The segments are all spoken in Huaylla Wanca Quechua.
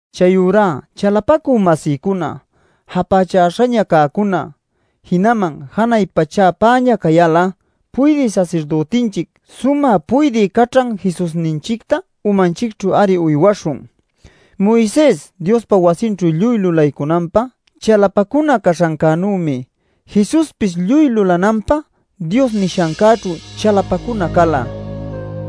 Chayurá chalapacü-masïcuna, japächäśhaña cäcuna, jinaman janay pachäpäña cayal'a, puydï sasirdütinchic, sumä puydï caćhan Jesusninchicta umanchicćhu-ari uywaśhun. Moises Diospa wasinćhu lluy lulaycunanpä chalapacuna caśhancänümi Jesuspis lluy lulananpä Dios nishancäćhu chalapacuna cala.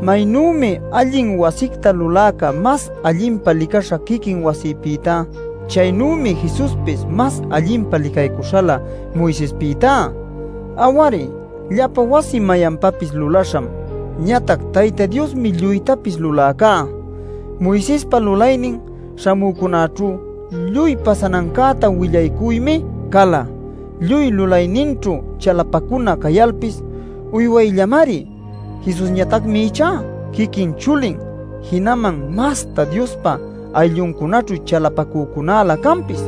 Maynümi allin wasicta luläca mas allinpa licaśha quiquin wasipïtá, chaynümi Jesuspis mas allinpa licaycuśhalä Moisespïtá. Aw-ari, llapa wasi mayanpapis lulaśham; ñatac Tayta Diosmi lluytapis luläcá. Moisespa lulaynin śhamücunäćhu lluy pasanancäta willaycuymi cala. Lluy lulayninćhu chalapacuna cayalpis uywayllamari. Jesusñatacmi ichá quiquin chulin, jinaman mastá Diospa aylluncunaćhu chalapacunalä canpis.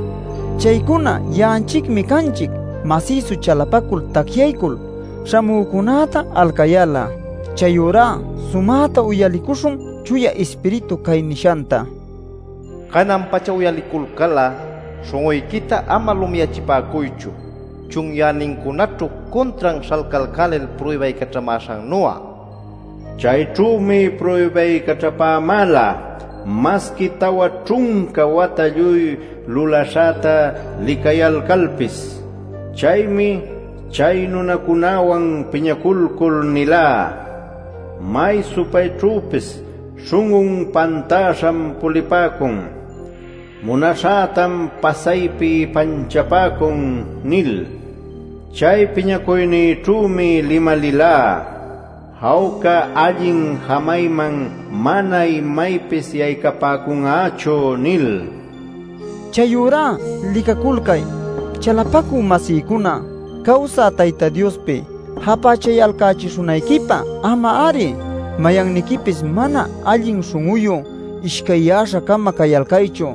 Chaycuna ya'anchicmi canchic masïsu chalapacul tacyaycul, śhamücunäta alcayal'a. Chayurá sumäta uyaliycuśhun Chuya Ispiritu cay nishanta: “Canan-pacha uyaliculcal'a, śhun'uyquita ama lumiyachipäcuychu chunyänincunaćhu cuntran śhalcalcälil pruybaycaćhamäśhannu'a. Chayćhümi pruybaycaćhapämäla, masqui tawa ćhunca wata lluy lulaśhäta licayalcalpis. Chaymi chay nunacunäwan piñaculcul nilá: ‘May supayćhüpis śhun'un pantäśham pulipäcun; munaśhätam pasaypi ipanchapäcun’ nil. Chay piñacuynïćhümi limalilá: ‘Jawca allin jamayman mana imaypis yaycapäcun'achu’ nil” nila. Chayurá licaculcay, chalapacü-masïcuna, cawsä Tayta Diospi japächayalcächishunayquipä ama-ari mayanniquipis mana allin śhun'uyu, ishcayyäśha-cama cayalcaychu.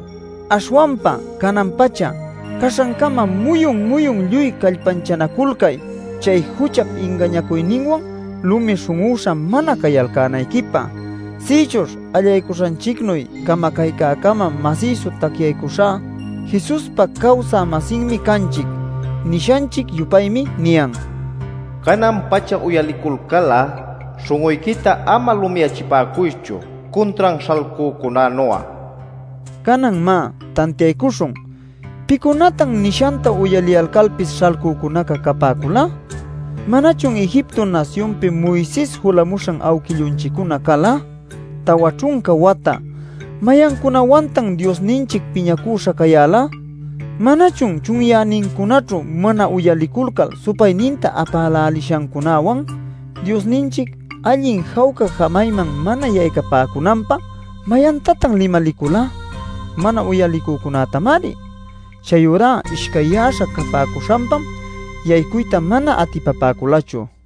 Aśhwanpa “canan-pacha” caśhancama muyun-muyun lluy callpanchanaculcay chay juchap ingañacuyninwan lumi śhun'üśha mana cayalcänayquipä. Sïchuśh allaycuśhanchicnuy camacaycama masïsu tacyaycuśhá Jesuspa cawsä-masinmi canchic. Nishanchic-yupaymi niyan: “Canan-pacha uyaliculcal'a, śhun'uyquita ama lumiyachipäcuychu cuntran śhalcücunänu'a” nil. Canan má, tantiaycuśhun: ¿Pïcunatan nishanta uyaliyalcalpis śhalcücunaca capäcula? ¿Manachun Egipto nasyunpi Moises julamuśhan awquillunchiccuna cala? Tawa ćhunca wata ¿mayancunawantan Diosninchic piñacüśha cayäla? ¿Manachun chunyänincunaćhu mana uyaliculcal supayninta apälälishancunäwan? Diosninchic allin jawca jamayman mana yaycapäcunanpä ¿mayantatan limalicula? Mana uyalicücunätamari. Chayurá ishcayyäśha capäcuśhanpam yaycuyta mana atipapäculachu.